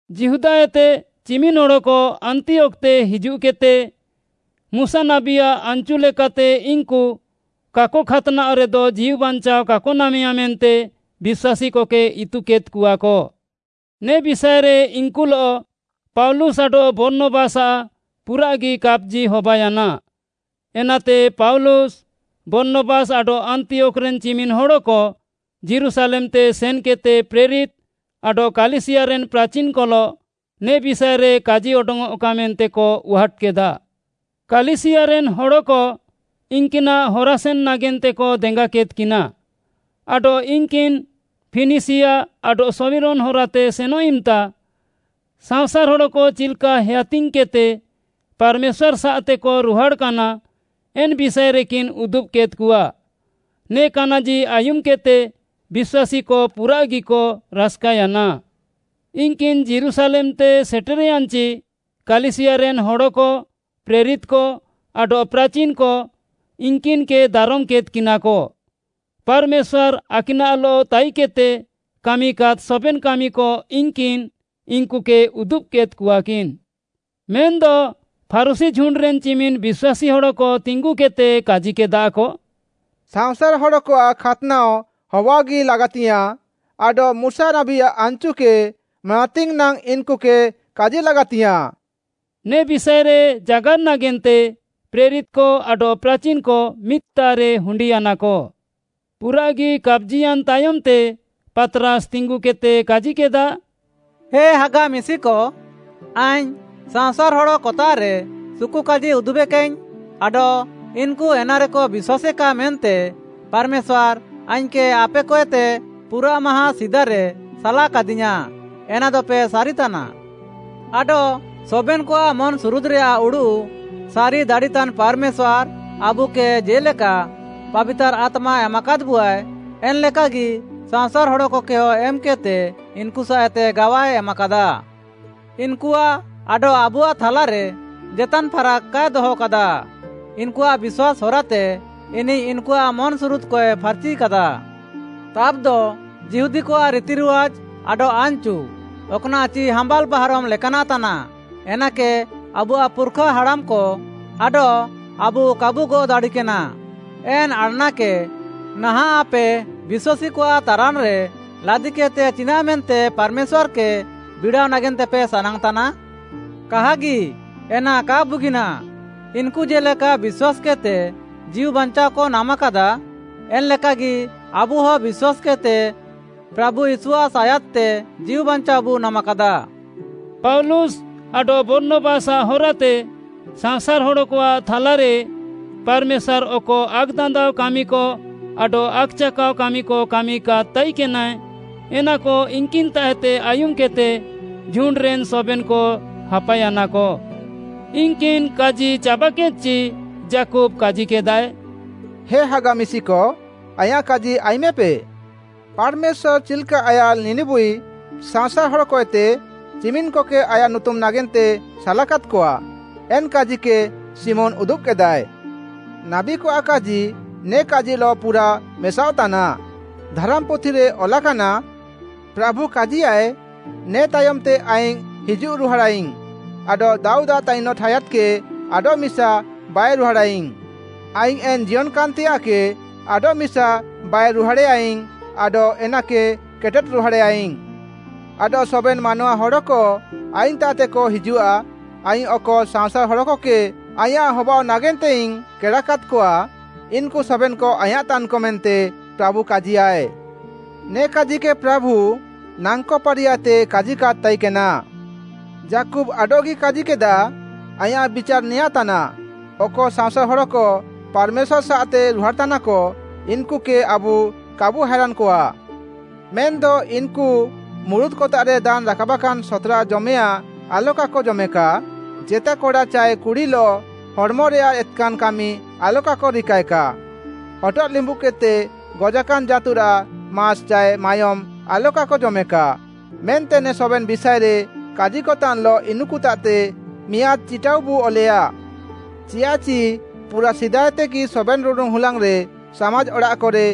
ଯିହୁଦାଏତେ ଚିମିନ୍‌ ହଡ଼କ ଆନ୍ତିୟୋଖ୍‌ତେ ହିଜୁଃକେଦ୍‌ତେ, ମୁଶା ନାବୀଆଃ ଆନ୍‌ଚୁ ଲେକାତେ ଇନ୍‌କୁ କାକ ଖାତ୍‌ନାଅଃରେଦ ଜୀଉବାଞ୍ଚାଅ କାକ ନାମେୟା ମେନ୍ତେ ବିଶ୍ୱାସୀକକେ ଇତୁକେଦ୍‌କଆକ। ନେ ବିଷାଏରେ ଇନ୍‌କୁଲଃ ପାଉଲୁସ୍‌ ଆଡଃ ବର୍ଣ୍ଣବାସ୍‌ଆଃ ପୁରାଃଗି କାପ୍‌ଜି ହବାୟାନା, ଏନାତେ ପାଉଲୁସ୍‌, ବର୍ଣ୍ଣବାସ୍‌ ଆଡଃ ଆନ୍ତିୟୋଖ୍‌ରେନ୍‌ ଚିମିନ୍‌ ହଡ଼କ ଯୀରୁଶାଲେମ୍‌ତେ ସେନ୍‌କେଦ୍‌ତେ ପ୍ରେରିତ୍‌ ଆଡଃ କାଲିସିୟାରେନ୍‌ ପ୍ରାଚିନ୍‌କଲଃ ନେ ବିଷାଏରେ କାଜିଅଡଙ୍ଗ୍‌ଅଃକା ମେନ୍ତେକ ଉହାଟ୍‌କେଦା। କାଲିସିୟାରେନ୍‌ ହଡ଼କ ଇନ୍‌କିନାଃ ହରାସେନ୍‌ ନାଗେନ୍ତେକ ଦେଙ୍ଗାକେଦ୍‌କିନା, ଆଡଃ ଇନ୍‌କିନ୍‌ ଫିନିସିୟା ଆଡଃ ଶମିରୋନ୍‌ ହରାତେ ସେନଃ ଇମ୍‌ତା, ସାଅଁସାର୍‌ ହଡ଼କ ଚିଲ୍‌କା ହେୟାତିଙ୍ଗ୍‌କେଦ୍‌ତେ ପାର୍‌ମେଶ୍ୱାର୍‌ସାଃତେକ ରୁହାଡ଼୍‌କାନା, ଏନ୍‌ ବିଷାଏରେକିନ୍‌ ଉଦୁବ୍‌କେଦ୍‌କଆ; ନେ କାନାଜି ଆୟୁମ୍‌କେଦ୍‌ତେ ବିଶ୍ୱାସୀକ ପୁରାଃଗିକ ରାସ୍‌କାୟାନା। ଇନ୍‌କିନ୍‌ ଯୀରୁଶାଲେମ୍‌ତେ ସେଟେର୍‌ୟାନ୍‌ଚି, କାଲିସିୟାରେନ୍‌ ହଡ଼କ, ପ୍ରେରିତ୍‌କ ଆଡଃ ପ୍ରାଚିନ୍‌କ ଇନ୍‍କିନ୍‍କେକ ଦାରମ୍‌କେଦ୍‌କିନା। ପାର୍‌ମେଶ୍ୱାର୍‌ ଆକିନାଃଲଃ ତାଇକେଦ୍‌ତେ କାମିକାଦ୍‌ ସବେନ୍‌ କାମିକ ଇନ୍‌କିନ୍‌ ଇନ୍‌କୁକେ ଉଦୁବ୍‌କେଦ୍‌କଆକିନ୍‌। ମେନ୍‌ଦ ଫାରୁଶୀ ଝୁଣ୍ଡ୍‌ରେନ୍‌ ଚିମିନ୍‌ ବିଶ୍ୱାସୀ ହଡ଼କ ତିଙ୍ଗୁକେଦ୍‌ତେ କାଜିକେଦାକ, “ସାଅଁସାର୍‌ ହଡ଼କଆଃ ଖାତ୍‌ନାଅ ହବାଅଃଗି ଲାଗାତିୟାଁ ଆଡଃ ମୁଶା ନାବୀଆଃ ଆନ୍‌ଚୁକେ ମାନାତିଙ୍ଗ୍‌ ନାଙ୍ଗ୍‌ ଇନ୍‌କୁକେ କାଜି ଲାଗାତିୟାଁ।” ନେ ବିଷାଏରେ ଜାଗାର୍‌ ନାଗେନ୍ତେ ପ୍ରେରିତ୍‌କ ଆଡଃ ପ୍ରାଚିନ୍‌କ ମିଦ୍‌ତାଃରେ ହୁଣ୍ଡିୟାନାକ। ପୁରାଃଗି କାପ୍‌ଜିୟାନ୍‌ ତାୟମ୍‌ତେ ପାତ୍‌ରାସ୍‌ ତିଙ୍ଗୁକେଦ୍‌ତେ କାଜିକେଦା, “ହେ ହାଗା ମିଶିକ, ଆଇଙ୍ଗ୍‌ ସାଅଁସାର୍‌ ହଡ଼କତାଃରେ ସୁକୁକାଜି ଉଦୁବେକାଇଙ୍ଗ୍‌ ଆଡଃ ଇନ୍‌କୁ ଏନାରେକ ବିଶ୍ୱାସେକା ମେନ୍ତେ ପାର୍‌ମେଶ୍ୱାର୍‌ ଆଇଙ୍ଗ୍‌କେ ଆପେକଏତେ ପୁରାଃ ମାହାଁ ସିଦାରେ ସାଲାକାଦିୟାଁ, ଏନାଦପେ ସାରିତାନା। ଆଡଃ ସବେନ୍‌କଆଃ ମନ୍‌ସୁରୁଦ୍‌ରେୟାଃ ଉଡ଼ୁଃ ସାରି ଦାଡ଼ିତାନ୍‌ ପାର୍‌ମେଶ୍ୱାର୍‌, ଆବୁକେ ଜେ'ଲେକା ପାବିତାର୍‌ ଆତ୍ମା ଏମାକାଦ୍‌ବୁଆଏ, ଏନ୍‌ଲେକାଗି ସାଅଁସାର୍‌ ହଡ଼କକେହ ଏମ୍‌କେଦ୍‌ତେ ଇନ୍‌କୁସାଃଏତେ ଗାୱାଏ ଏମାକାଦା। ଇନ୍‌କୁଆଃ ଆଡଃ ଆବୁଆଃ ଥାଲାରେ ଜେତାନ୍‌ ଫାରାକ୍‌ କାଏ ଦହକାଦା। ଇନ୍‌କୁଆଃ ବିଶ୍ୱାସ୍‌ ହରାତେ ଇନିଃ ଇନ୍‌କୁଆଃ ମନ୍‌ସୁରୁଦ୍‌କଏ ଫାର୍‌ଚିକାଦା। ତାବ୍‌ଦ ଯିହୁଦୀକଆଃ ରିତିରିୱାଜ୍‌ ଆଡଃ ଆନ୍‌ଚୁ, ଅକ୍‌ନାଃଚି ହାମ୍ବାଲ୍‌ ବାହାରମ୍‌ ଲେକାନାଃତାନାଃ, ଏନାକେ ଆବୁଆଃ ପୁର୍‌ଖା ହାଡ଼ାମ୍‌କ ଆଡଃ ଆବୁ କାବୁ ଗଅଃ ଦାଡ଼ିକେନା, ଏନ୍‌ ଆଡ଼୍‌ନାକେ ନାହାଁଃ ଆପେ ବିଶ୍ୱାସୀକଆଃ ତାରାନ୍‌ରେ ଲାଦିକେଦ୍‌ତେ ଚିନାଃମେନ୍ତେ ପାର୍‌ମେଶ୍ୱାର୍‌କେ ବିଡ଼ାଅ ନାଗେନ୍ତେପେ ସାନାଙ୍ଗ୍‌ତାନା? କାହାଗି, ଏନା କା ବୁଗିନାଃ। ଇନ୍‌କୁ ଜେ'ଲେକା ବିଶ୍ୱାସ୍‌କେଦ୍‌ତେ ଜୀଉବାଞ୍ଚାଅକ ନାମାକାଦା, ଏନ୍‌ ଲେକାଗି ଆବୁହ ବିଶ୍ୱାସ୍‌କେଦ୍‌ତେ ପ୍ରାଭୁ ୟୀଶୁଆଃ ସାୟାଦ୍‌ତେ ଜୀଉବାଞ୍ଚାଅବୁ ନାମାକାଦା।” ପାଉଲୁସ୍‌ ଆଡଃ ବର୍ଣ୍ଣବାସ୍‌ଆଃ ହରାତେ ସାଅଁସାର୍‌ ହଡ଼କଆଃ ଥାଲାରେ ପାର୍‌ମେଶ୍ୱାର୍‌ ଅକ ଆକ୍‌ଦାନ୍ଦାଅ କାମିକ ଆଡଃ ଆକ୍‌ଚାକାଅ କାମିକ କାମିକାଦ୍‌ ତାଇକେନାଏ। ଏନାକ ଇନ୍‌କିନ୍‌ତାଃଏତେ ଆୟୁମ୍‌କେଦ୍‌ତେ ଝୁଣ୍ଡ୍‌ରେନ୍‌ ସବେନ୍‌କ ହାପାୟାନାକ। ଇନ୍‌କିନ୍‌ କାଜି ଚାବାକେଦ୍‌ଚି, ଯାକୁବ୍‌ କାଜିକେଦାଏ, “ହେ ହାଗା ମିଶିକ, ଆଇଁୟାଃ କାଜି ଆୟୁମେପେ! ପାର୍‌ମେଶ୍ୱାର୍‌ ଚିଲ୍‌କା ଆୟାଃ ଲିନିବୁଇ ସାଅଁସାର୍‌ ହଡ଼କଏତେ ଚିମିନ୍‌କକେ ଆୟାଃ ନୁତୁମ୍‌ ନାଗେନ୍ତେ ସାଲାକାଦ୍‌କଆ, ଏନ୍‌ କାଜିକେ ଶିମୋନ୍‌ ଉଦୁବ୍‌କେଦାଏ। ନାବୀକଆଃ କାଜି ନେ କାଜିଲଃ ପୁରା ମେସାଅଃତାନା। ଧାରାମ୍‌ପୁଥିରେ ଅଲାକାନା; “‘ପ୍ରାଭୁ କାଜିୟାଃଏ, ନେ ତାୟମ୍‌ତେ ଆଇଙ୍ଗ୍‌ ହିଜୁଃ ରୁହାଡ଼ାଇଙ୍ଗ୍‌ ଆଡଃ ଦାଉଦ୍‌ଆଃ ତାଇନଃ ଠାୟାଦ୍‌କେ ଆଡଃମିସା ବାଇରୁହାଡ଼େୟାଇଙ୍ଗ୍‌। ଆଇଙ୍ଗ୍‌ ଏନ୍‌ ଜିୟନ୍‌କାନ୍‌ତେୟାଃକେ ଆଡଃମିସା ବାଇରୁହାଡ଼େୟାଇଙ୍ଗ୍‌ ଆଡଃ ଏନାକେ କେଟେଦ୍‌ ରୁହାଡ଼େୟାଇଙ୍ଗ୍‌। ଆଡଃ ସବେନ୍‌ ମାନୱା ହଡ଼କ ଆଇଙ୍ଗ୍‌ତାଃତେକ ହିଜୁଃଆ, ଆଇଙ୍ଗ୍‌ ଅକ ସାଅଁସାର୍‌ ହଡ଼କକେ ଆଇଁୟାଃ ହବାଅଃ ନାଗେନ୍ତେଇଙ୍ଗ୍‌ କେଡ଼ାକାଦ୍‌କଆ, ଇନ୍‌କୁ ସବେନ୍‌କ ଆଇଁୟାଃତାନ୍‌କ ମେନ୍ତେ ପ୍ରାଭୁ କାଜିୟାଏ। ନେ କାଜିକେ ପ୍ରାଭୁ, ନାଙ୍କ ପାରିୟାଏତେ କାଜିକାଦ୍‌ ତାଇକେନା।’ “ଯାକୁବ୍‌ ଆଡଃଗି କାଜିକେଦା, ଆଇଁୟାଃ ବିଚାର୍‌ ନେଆଁତାନାଃ, ଅକ ସାଅଁସାର୍‌ ହଡ଼କ ପାର୍‌ମେଶ୍ୱାର୍‌ସାଃତେ ରୁହାଡ଼୍‌ତାନାକ, ଇନ୍‌କୁକେ ଆବୁ କାବୁ ହାଏରାନ୍‌କଆ। ମେନ୍‌ଦ ଇନ୍‌କୁ ମୁରୁତ୍‌କତାଃରେ ଦାନ୍‌ ରାକାବାକାନ୍‌ ସତ୍‌ରା ଜମେୟାଁ ଆଲକାକ ଜମେକା, ଜେତା କଡ଼ା ଚାଏ କୁଡ଼ିଲଃ ହଡ଼୍‌ମରେୟାଃ ଏତ୍‌କାନ୍‌ କାମି ଆଲକାକ ରିକାଏକା, ହଟଃ ଲିମ୍ବୁଦ୍‌କେଦ୍‌ତେ ଗଜାକାନ୍‌ ଜାଁତୁରାଃ ମାସ୍‌ ଚାଏ ମାୟୋମ୍‌ ଆଲକାକ ଜମେକା ମେନ୍ତେ ନେ ସବେନ୍‌ ବିଷାଏରେ କାଜିକତାନ୍‌ଲଃ ଇନ୍‌କୁତାଃତେ ମିଆଁଦ୍‌ ଚିଟାଉବୁ ଅଲେୟା। ଚିୟାଃଚି ପୁରାଃ ସିଦାଏତେଗି ସବେନ୍‌ ରୁଡ଼ୁନ୍‌ ହୁଲାଙ୍ଗ୍‌ରେ ସାମାଜ୍‌ ଅଡ଼ାଃକରେ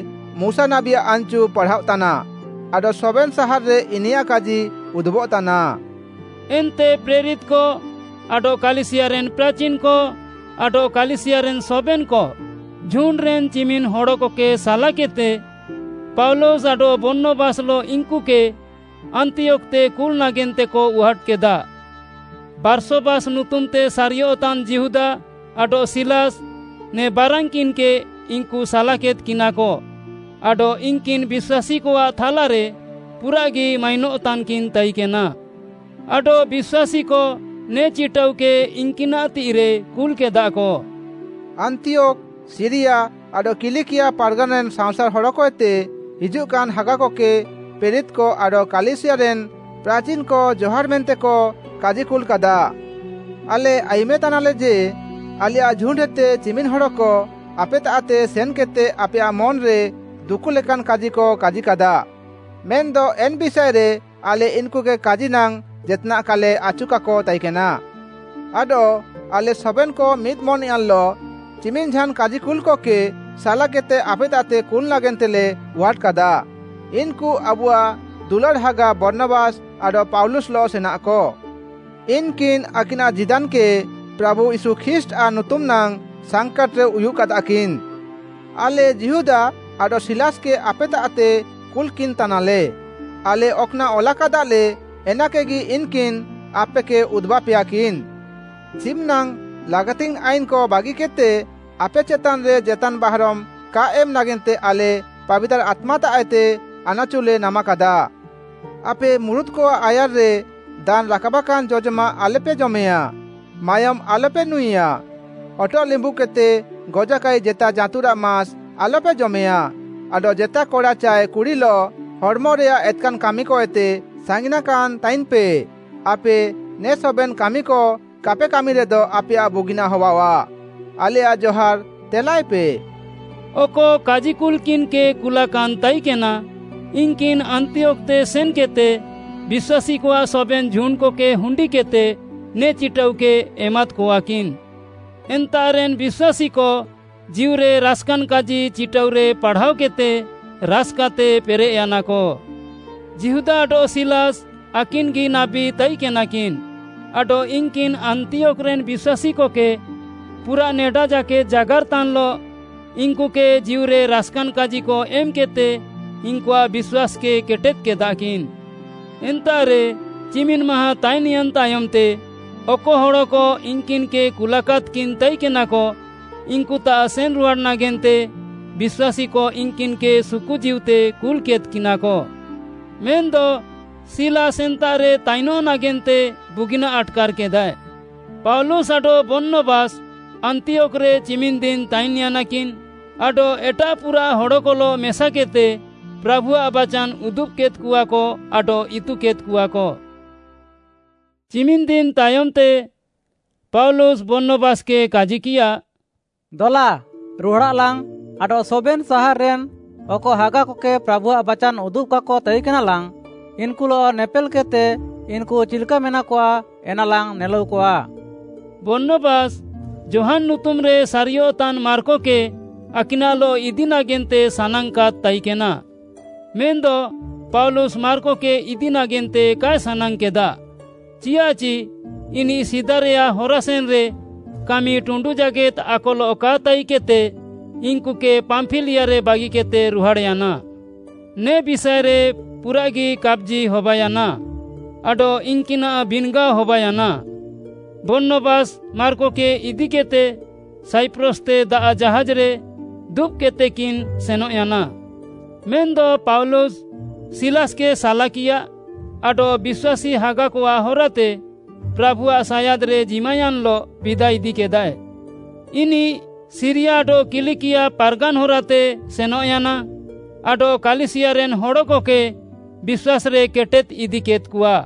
ମୁଶା ନାବୀଆଃ ଆନ୍‌ଚୁ ପାଢ଼ାଅଃତାନା, ଆଡଃ ସବେନ୍‌ ସାହାର୍‌ରେ ଇନିୟାଃ କାଜି ଉଦୁବଃତାନା।” ଏନ୍ତେ ପ୍ରେରିତ୍‌କ ଆଡଃ କାଲିସିୟାରେନ୍‌ ପ୍ରାଚିନ୍‌କ, ଆଡଃ କାଲିସିୟାରେନ୍‌ ସବେନ୍‌କ, ଝୁଣ୍ଡ୍‌ରେନ୍‌ ଚିମିନ୍‌ ହଡ଼କକେ ସାଲାକେଦ୍‌ତେ, ପାଉଲୁସ୍‌ ଆଡଃ ବର୍ଣ୍ଣବାସ୍‌ଲଃ ଇନ୍‌କୁକେ ଆନ୍ତିୟୋଖ୍‌ତେ କୁଲ୍‌ ନାଗେନ୍ତେକ ଉହାଟ୍‌କେଦା। ବାର୍ଶବାସ୍‌ ନୁତୁମ୍‌ତେ ସାରିୟଃତାନ୍‌ ଯିହୁଦା ଆଡଃ ସିଲାସ୍‌, ନେ ବାରାନ୍‌କିନ୍‌କେ ଇନ୍‌କୁ ସାଲାକେଦ୍‌କିନାକ ଆଡଃ ଇନ୍‌କିନ୍‌ ବିଶ୍ୱାସୀକଆଃ ଥାଲାରେ ପୁରାଃଗି ମାଇନଃତାନ୍‌କିନ୍‌ ତାଇକେନା। ଆଡଃ ବିଶ୍ୱାସୀକ ନେ ଚିଟାଉକେ ଇନ୍‌କିନାଃ ତିଃଇରେ କୁଲ୍‌କେଦାକ। “ଆନ୍ତିୟୋଖ୍‌, ସିରିୟା ଆଡଃ କିଲିକିଆ ପାର୍‌ଗାନ୍‌ରେନ୍‌ ସାଅଁସାର୍‌ ହଡ଼କଏତେ ହିଜୁଃକାନ୍‌ ହାଗାକକେ ପ୍ରେରିତ୍‌କ ଆଡଃ କାଲିସିୟାରେନ୍‌ ପ୍ରାଚିନ୍‌କ ଜହାର୍‌ ମେନ୍ତେକ କାଜିକୁଲ୍‌କାଦା। ଆଲେ ଆୟୁମେତାନାଲେ ଯେ, ଆଲେୟାଃ ଝୁଣ୍ଡ୍‌ହେତେ ଚିମିନ୍‌ ହଡ଼କ ଆପେତାଃତେ ସେନ୍‌କେଦ୍‌ତେ ଆପେୟାଃ ମନ୍‌ରେ ଦୁକୁଃଲେକାନ୍‌ କାଜିକ କାଜିକାଦା। ମେନ୍‌ଦ ଏନ୍‌ ବିଷାଏରେ ଆଲେ ଇନ୍‌କୁକେ କାଜି ନାଙ୍ଗ୍‌ ଜେତ୍‌ନାଃ କାଲେ ଆଚୁକାକ ତାଇକେନା। ଆଡଃ ଆଲେ ସବେନ୍‌କ ମିଦ୍‌ ମନ୍‌ୟାନ୍‌ଲଃ ଚିମିନ୍‌ ଝାନ୍‌ କାଜିକୁଲ୍‌କକେ ସାଲାକେଦ୍‌ତେ ଆପେତାଃତେ କୁଲ୍‌ ନାଗେନ୍ତେଲେ ଉହାଟ୍‌କାଦା। ଇନ୍‌କୁ ଆବୁଆଃ ଦୁଲାଡ଼୍‌ ହାଗା ବର୍ଣ୍ଣବାସ୍‌ ଆଡଃ ପାଉଲୁସ୍‌ଲଃ ସେନାଃକ। ଇନ୍‌କିନ୍‌ ଆକିନାଃ ଜୀଦାନ୍‌କେ ପ୍ରାଭୁ ୟୀଶୁ ଖ୍ରୀଷ୍ଟ୍‌ଆଃ ନୁତୁମ୍‌ ନାଙ୍ଗ୍‌ ସାଙ୍କାଟ୍‌ରେ ଉୟୁଃକାଦାକିନ୍‌। ଆଲେ ଯିହୁଦା ଆଡଃ ସିଲାସ୍‌କେ ଆପେତାଃତେ କୁଲ୍‌କିନ୍‌ତାନାଲେ। ଆଲେ ଅକ୍‌ନାଃ ଅଲାକାଦାଲେ ଏନାକେଗି ଇନ୍‌କିନ୍‌ ଆପେକେ ଉଦୁବାପେୟାକିନ୍‌। ଚିମିନାଙ୍ଗ୍‌ ଲାଗାତିଙ୍ଗ୍‌ ଆଇନ୍‌କ ବାଗିକେଦ୍‌ତେ ଆପେ ଚେତାନ୍‌ରେ ଜେତାନ୍‌ ବାହାରମ୍‌ କା ଏମ୍‌ ନାଗେନ୍ତେ ଆଲେ ପାବିତାର୍‌ ଆତ୍ମାତାଃଏତେ ଆନାଚୁଲେ ନାମାକାଦା। ଆପେ ମୁରୁତ୍‍କଆଃ ଆୟାର୍‌ରେ ଦାନ୍‌ ରାକାବାକାନ୍‌ ଜଜମାଃ ଆଲପେ ଜମେୟାଁ, ମାୟୋମ୍‌ ଆଲପେ ନୁଁଇଆ, ହଟଃ ଲିମ୍ବୁଦ୍‌କେଦ୍‌ତେ ଗଜାକାଇ ଜେତା ଜାଁତୁରାଃ ମାସ୍‌ ଆଲପେ ଜମେୟାଁ ଆଡଃ ଜେତା କଡ଼ା ଚାଏ କୁଡ଼ିଲଃ ହଡ଼୍‌ମରେୟାଃ ଏତ୍‌କାନ୍‌ କାମିକଏତେ ସାଙ୍ଗିନାକାନ୍‌ ତାଇନ୍‌ପେ। ଆପେ ନେ ସବେନ୍‌ କାମିକ କାପେ କାମିରେଦ ଆପେୟାଃ ବୁଗିନାଃ ହବାଅଃଆ। ଆଲେୟାଃ ଜହାର୍‌ ତେଲାଏପେ।” ଅକ କାଜିକୁଲ୍‌କିନ୍‌କେ କୁଲାକାନ୍‌ ତାଇକେନା, ଇନ୍‌କିନ୍‌ ଆନ୍ତିୟୋଖ୍‌ତେ ସେନ୍‌କେଦ୍‌ତେ ବିଶ୍ୱାସୀକଆଃ ସବେନ୍‌ ଝୁଣ୍ଡ୍‌କକେ ହୁଣ୍ଡିକେଦ୍‌ତେ ନେ ଚିଟାଉକେ ଏମାଦ୍‌କଆକିନ୍‌। ଏନ୍ତାଃରେନ୍‌ ବିଶ୍ୱାସୀକ ଜୀଉରେ ରାସ୍‌କାନ୍‌ କାଜି ଚିଟାଉରେ ପାଢ଼ାଅକେଦ୍‌ତେ ରାସ୍‌କାତେ ପେରେଃୟାନାକ। ଯିହୁଦା ଆଡଃ ସିଲାସ୍‌ ଆକିନ୍‌ଗି ନାବୀ ତାଇକେନାକିନ୍‌ ଆଡଃ ଇନ୍‌କିନ୍‌ ଆନ୍ତିୟୋଖ୍‌ରେନ୍‌ ବିଶ୍ୱାସୀକକେ ପୁରାଃ ନେଡା ଜାକେଦ୍‌ ଜାଗାର୍‌ତାନ୍‌ଲଃ ଇନ୍‌କୁକେ ଜୀଉରେ ରାସ୍‌କାନ୍‌ କାଜିକ ଏମ୍‌କେଦ୍‌ତେ ଇନ୍‌କୁଆଃ ବିଶ୍ୱାସ୍‌କେ କେଟେଦ୍‌କେଦାକିନ୍‌। ଏନ୍ତାଃରେ ଚିମିନ୍‌ ମାହାଁ ତାଇନ୍‌ୟାନ୍‌ ତାୟମ୍‌ତେ ଅକ ହଡ଼କ ଇନ୍‌କିନ୍‌କେ କୁଲାକାଦ୍‌କିନ୍‌ ତାଇକେନାକ, ଇନ୍‌କୁତାଃ ସେନ୍‌ରୁହାଡ଼୍‌ ନାଗେନ୍ତେ ବିଶ୍ୱାସୀକ ଇନ୍‌କିନ୍‌କେ ସୁକୁଜୀଉତେ କୁଲ୍‌କେଦ୍‌କିନାକ। ମେନ୍‌ଦ ସିଲାସ୍‌ ଏନ୍ତାଃରେ ତାଇନଃ ନାଗେନ୍ତେ ବୁଗିନାଃ ଆଟ୍‌କାର୍‌କେଦାଏ। ପାଉଲୁସ୍‌ ଆଡଃ ବର୍ଣ୍ଣବାସ୍‌ ଆନ୍ତିୟୋଖ୍‌ରେ ଚିମିନ୍‌ ଦିନ୍‌ ତାଇନ୍‌ୟାନାକିନ୍‌ ଆଡଃ ଏଟାଃ ପୁରାଃ ହଡ଼କଲଃ ମେସାକେଦ୍‌ତେ ପ୍ରାଭୁଆଃ ବାଚାନ୍‌ ଉଦୁବ୍‌କେଦ୍‌କଆକ ଆଡଃ ଇତୁକେଦ୍‌କଆକ। ଚିମିନ୍‍ ଦିନ୍‍ ତାୟମ୍‍ତେ ପାଉଲୁସ୍‌, ବର୍ଣ୍ଣବାସ୍‌କେ କାଜିକିୟା, “ଦଲା, ରୁହାଡ଼ାଃଲାଙ୍ଗ୍‌ ଆଡଃ ସବେନ୍‌ ସାହାର୍‌ରେନ୍‌ ଅକ ହାଗାକକେ ପ୍ରାଭୁଆଃ ବାଚାନ୍‌ ଉଦୁବ୍‌କାକ ତାଇକେନାଲାଙ୍ଗ୍‌, ଇନ୍‌କୁଲଃ ନେପେଲ୍‌କେଦ୍‌ତେ, ଇନ୍‌କୁ ଚିଲ୍‌କା ମେନାକଆ ଏନାଲାଙ୍ଗ୍‌ ନେଲାଉକଆ।” ବର୍ଣ୍ଣବାସ୍‌, ଯୋହାନ୍‌ ନୁତୁମ୍‌ରେ ସାରିୟଃତାନ୍‌ ମାର୍କକେ ଆକିନାଃଲଃ ଇଦି ନାଗେନ୍ତେ ସାନାଙ୍ଗ୍‌କାଦ୍‌ ତାଇକେନା, ମେନ୍‌ଦ ପାଉଲୁସ୍‌ ମାର୍କକେ ଇଦି ନାଗେନ୍ତେ କାଏ ସାନାଙ୍ଗ୍‌କେଦା, ଚିଆଃଚି ଇନିଃ ସିଦାରେୟାଃ ହରାସେନ୍‌ରେ କାମି ଟୁଣ୍ଡୁଃ ଜାକେଦ୍‌ ଆକଲଃ କା ତାଇକେଦ୍‌ତେ ଇନ୍‌କୁକେ ପାମ୍ପିଲିଆରେ ବାଗିକେଦ୍‌ତେ ରୁହାଡ଼୍‌ୟାନା। ନେ ବିଷାଏରେ ପୁରାଃଗି କାପ୍‌ଜି ହବାୟାନା ଆଡଃ ଇନ୍‌କିନାଃ ବିନ୍‌ଗାଅ ହବାୟାନା। ବର୍ଣ୍ଣବାସ୍‌ ମାର୍କକେ ଇଦିକେଦ୍‌ତେ ସାଇପ୍ରସ୍‌ତେ ଦାଆଃ ଜାହାଜ୍‌ରେ ଦୁବ୍‌କେଦ୍‌ତେକିନ୍‌ ସେନଃୟାନା। ମେନ୍‌ଦ ପାଉଲୁସ୍‌, ସିଲାସ୍‌କେ ସାଲାକିୟା ଆଡଃ ବିଶ୍ୱାସୀ ହାଗାକଆଃ ହରାତେ ପ୍ରାଭୁଆଃ ସାୟାଦ୍‌ରେ ଜିମାୟାନ୍‌ଲଃ ବିଦା ଇଦିକେଦାଏ। ଇନିଃ ସିରିୟା ଆଡଃ କିଲିକିଆ ପାର୍‌ଗାନ୍‌ ହରାତେ ସେନଃୟାନା ଆଡଃ କାଲିସିୟାରେନ୍‌ ହଡ଼କକେ ବିଶ୍ୱାସ୍‌ରେ କେଟେଦ୍‌ ଇଦିକେଦ୍‌କଆ।